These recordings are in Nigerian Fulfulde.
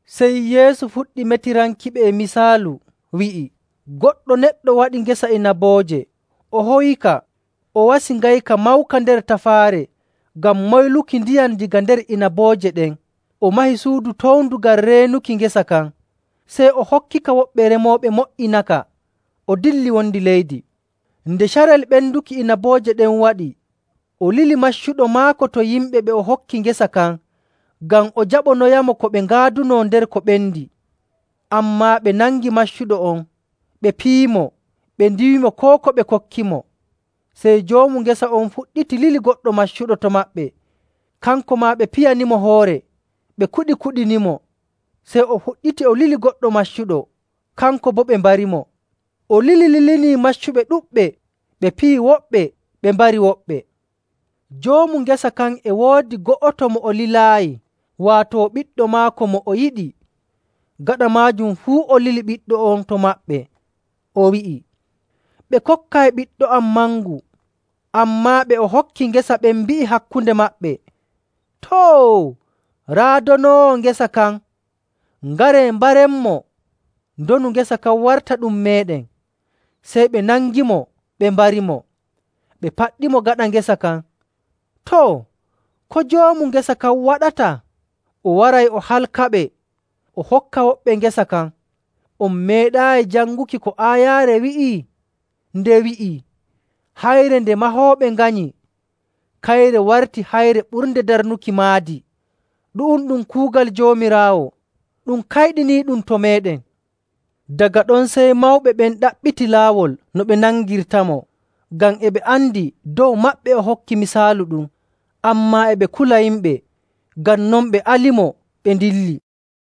Sey Yeesu fuɗɗi metirankiɓe e misaalu, wi'i, “Goɗɗo neɗɗo waɗi ngesa inabooje, o howika, o wasi ngayka mawka nder tafaare ngam moyluki ndiyam daga nder inabooje ɗen, o mahi suudu towndu ngam reenuki ngesa kan. Sey o hokkika woɓɓe remooɓe mo''inaka, o dilli wondi leydi.. Nde carel ɓenduki inabooje ɗen waɗi, o lili maccuɗo maako to yimɓe ɓe o hokki ngesa kan ngam o jaɓanoyamo ko ɓe ngaadunoo nder ko ɓendi. Ammaa ɓe nangi maccuɗo on, ɓe piyimo, ɓe ndiiwimo koo ko ɓe kokkimo. Sey joomu ngesa on fuɗɗiti lili goɗɗo maccuɗo to maɓɓe, kanko maa ɓe piyanimo hoore, ɓe kuɗikuɗinimo. Sey o fuɗɗiti o lili goɗɗo maccuɗo, kanko boo ɓe mbarimo. O lilililinii maccuɓe ɗuɗɓe. Ɓe piyi woɓɓe, ɓe mbari woɓɓe. Joomu ngesa kan e woodi go'oto mo o lilaayi, waato ɓiɗɗo maako mo o yiɗi. Gaɗa maajum fuu o lili ɓiɗɗo on to maɓɓe, o wi'i, ‘Ɓe kokkay ɓiɗɗo am mangu.’ Ammaa ɓe o hokki ngesa ɓen mbi'i hakkunde maɓɓe, ‘Too! Raa donoowo ngesa kan. Ngaree mbarenmo, ndonu ngesa kan warta ɗum meeɗen.’ Sey ɓe nangimo ɓe mbarimo, ɓe paɗɗimo gaɗa ngesa kan. “Too, ko joomu ngesa kan waɗata? O waray o halkaɓe, o hokka woɓɓe ngesa kan. On meeɗaayi janguki ko aayaare wi'i? Nde wi'ii, ‘Hayre nde mahooɓe nganyi kayre warti hayre ɓurnde darnuki maadi. Ɗu'um ɗum kuugal Joomiraawo, ɗum kayɗiniiɗum to meeɗen.’”. Daga ɗon sey mawɓe ɓen ɗaɓɓiti laawol no ɓe nangirtamo, ngam e ɓe andi dow maɓɓe o hokki misaalu ɗum, ammaa e ɓe kula yimɓe. Ngam non ɓe alimo, ɓe ndilli.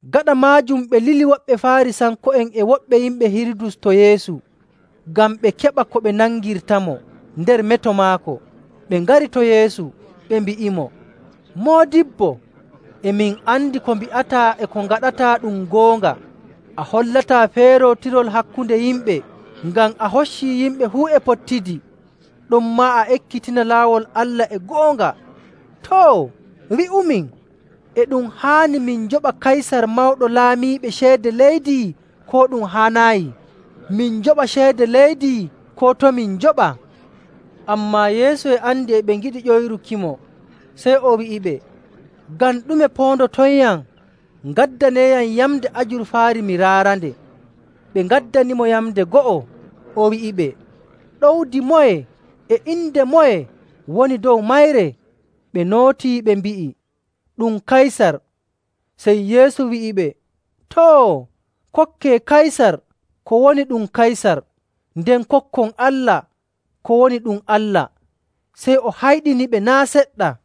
Gaɗa maajum ɓe lili woɓɓe Faarisanko'en e woɓɓe yimɓe Hirudus to Yeesu ngam ɓe keɓa ko ɓe nangirtamo nder meto maako. Ɓe ngari to Yeesu, ɓe mbi'imo, “Moodibbo, e min andi ko mbi'ataa e ko ngaɗataa ɗum goonga. A hollataa feerootirol hakkunde yimɓe, ngam a hoccii yimɓe fuu e pottidi. Ɗonmaa a ekkitina laawol Allah e goonga. Too, wi'umin, e ɗum haani min njoɓa Kaysar Mawɗo Laamiiɓe ceede leydi, koo ɗum haanaayi? Min njoɓa ceede leydi, koo to' min njoɓa?” Ammaa Yeesu e andi e ɓe ngiɗi ƴoyrukimo, sey o wi'iɓe, “Ngam ɗume poondotonyam? Ngaddaneeyam yamnde ajurfaari mi raarande.” Ɓe ngaddanimo yamnde go'o. O wi'iɓe, “Ɗowdi moye e inde moye woni dow mayre?” Ɓe nootii ɓe mbi'i, “Ɗum Kaysar.” Sey Yeesu wi'iɓe, “Too, kokkee Kaysar ko woni ɗum Kaysar, nden kokkon Allah ko woni ɗum Allah.” Sey o hayɗiniɓe naa' seɗɗa.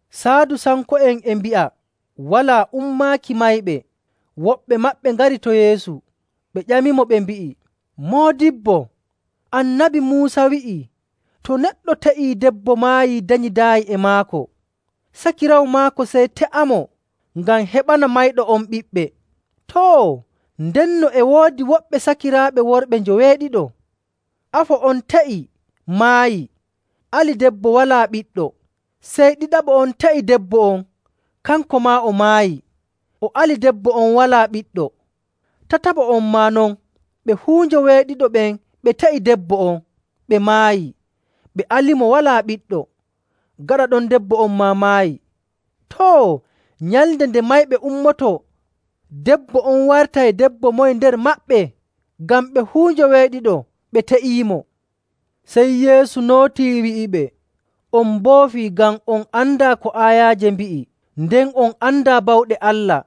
Saadusanko'en e mbi'a walaa ummaaki mayɓe. Woɓɓe maɓɓe ngari to Yeesu, ɓe ƴamimo, ɓe mbi'i,. “Moodibbo, Annabi Muusa wi'ii to neɗɗo te'ii debbo maayii danyidaayi e maako, sakiraawo maako sey te'amo ngam heɓana mayɗo on ɓiɓɓe.. Too, ndenno e woodi woɓɓe sakiraaɓe worɓe njoweeɗiɗo. Afo on te'i, maayi, ali debbo walaa ɓiɗɗo. Sey ɗiɗaɓo on te'i debbo on. Kanko maa o maayi, o ali debbo on walaa ɓiɗɗo. Tataɓo on maa non. Ɓe fuu njoweeɗiɗo ɓen ɓe te'ii debbo on, ɓe maayi, ɓe alimo walaa ɓiɗɗo. Gaɗa ɗon debbo on maa maayi. Too, nyalnde nde mayɓe ummotoo, debbo on wartay debbo moye nder maɓɓe? Ngam ɓe fuu njoweeɗiɗo ɓe te'iimo.” Sey Yeesu nootii wi'iɓe, “On mboofii ngam on andaa ko aayaaje mbi'i, nden on andaa bawɗe Allah.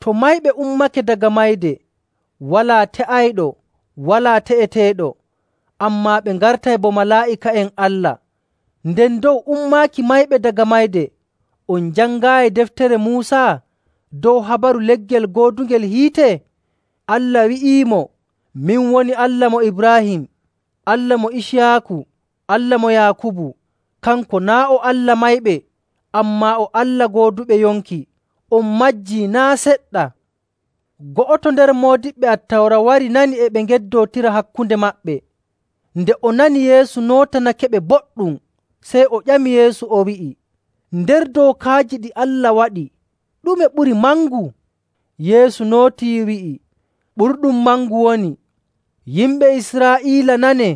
To mayɓe ummake daga mayde, walaa te'ayɗo walaa te'eteeɗo, ammaa ɓe ngartay bo malaa'ika'en Allah. Nden dow ummaaki mayɓe daga mayde, on jangaayi deftere Muusa dow habaru leggel goodungel hiite? Allah wi'iimo, ‘Min woni Allah mo Ibraahim, Allah mo Iciyaaku, Allah mo Yaakubu.’. Kanko naa' o Allah mayɓe, ammaa o Allah gooduɓe yonki. On majji naa' seɗɗa!” Go'oto nder moodiɓɓe Attawra wari nani e ɓe ngeddootira hakkunde maɓɓe. Nde o nani Yeesu nootanakeɓe boɗɗum, sey o ƴami Yeesu, o wi'i, “Nder dookaaji ɗi Allah waɗi, ɗume ɓuri mangu?” Yeesu nootii wi'i, “Ɓurɗum mangu woni, ‘Yimɓe Israa'iila nanee,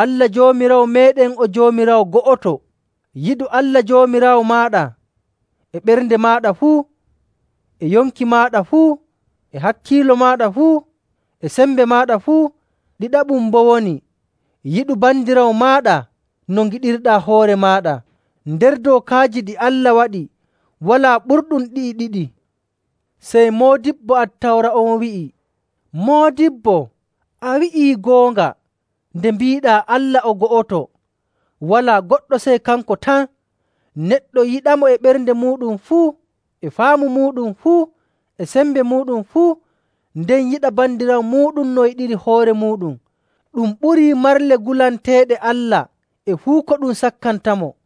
Allah Joomiraawo meeɗen o Joomiraawo go'oto. Yiɗu Allah Joomiraawo maaɗa e ɓernde maaɗa fuu, e yonki maaɗa fuu, e hakkiilo maaɗa fuu, e sembe maaɗa fuu.’. Ɗiɗaɓum boo woni, ‘Yiɗu bandiraawo maaɗa no ngiɗirɗaa hoore maaɗa.’ Nder dookaaji ɗi Allah waɗi walaa ɓurɗum ɗi'i ɗiɗi.”. Sey moodibbo Attawra on wi'i, “Moodibbo, a wi'ii goonga nde mbiiɗaa Allah o go'oto, walaa goɗɗo sey kanko tan.. Neɗɗo yiɗamo e ɓernde muuɗum fuu, e faamu muuɗum fuu, e sembe muuɗum fuu, nden yiɗa bandiraawo muuɗum no yiɗiri hoore muuɗum, ɗum ɓurii marle gulanteeɗe Allah e fuu ko ɗum sakkantamo.”.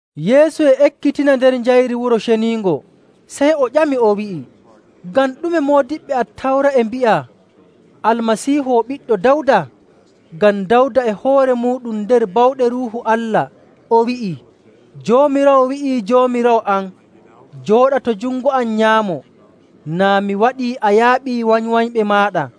Yeesu e ekkitina nder njayri Wuro Ceniingo, sey o ƴami, o wi'i, “Ngam ɗume moodiɓɓe Attawra e mbi'a Almasiihu o ɓiɗɗo Dawda? Ngam Dawda e hoore muuɗum, nder bawɗe Ruuhu Allah o wi'ii, ‘Joomiraawo wi'ii Joomiraawo am, “Jooɗa to jungo am nyaamo, naa mi waɗii a yaaɓii wanywanyɓe maaɗa.”’.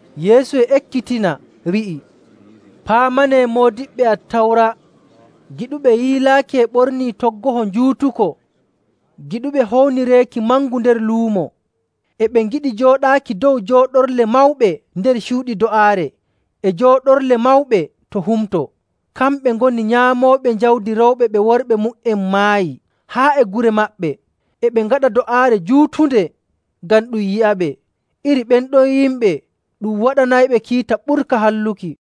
Yeesu e ekkitina, wi'i, “Paamanee moodiɓɓe Attawra, giɗuɓe yiilaaki e ɓornii toggoho njuutuko, giɗuɓe hownireeki mangu nder luumo. E ɓe ngiɗi jooɗaaki dow jooɗorle mawɓe nder cuuɗi do'aare e jooɗorle mawɓe to humto. Kamɓe ngoni nyaamooɓe jawdi rewɓe ɓe worɓe mu''en maayi haa e gure maɓɓe, e ɓe ngaɗa do'aare juutunde ngam ɗum yi'aɓe. Iri ɓen ɗon yimɓe ɗum waɗanayɓe kiita ɓurka halluki.”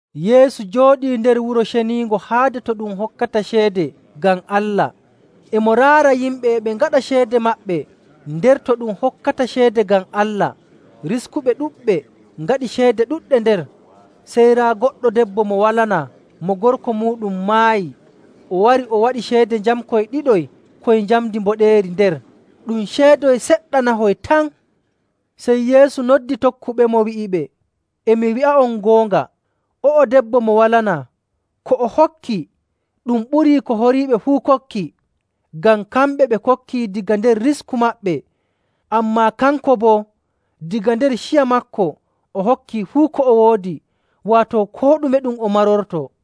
Yeesu jooɗii nder Wuro Ceniingo haade to ɗum hokkata ceede ngam Allah. E mo raara yimɓe e ɓe ngaɗa ceede maɓɓe nder to ɗum hokkata ceede ngam Allah. Riskuɓe ɗuɗɓe ngaɗi ceede ɗuɗɗe nder. Sey raa goɗɗo debbo mo walanaa mo gorko muuɗum maayi. O wari o waɗi ceede njamkoy ɗiɗoy koy njamndi mboɗeeri nder. Ɗum ceedoy seɗɗanahoy tan. Sey Yeesu noddi tokkuɓemo, wi'iɓe, “E mi wi'a'on goonga, o'o debbo mo walanaa, ko o hokki ɗum ɓurii ko horiiɓe fuu kokki. Ngam kamɓe ɓe kokki daga nder risku maɓɓe. Ammaa kanko boo, daga nder ciya maako, o hokki fuu ko o woodi, waato koo ɗume ɗum o marortoo.”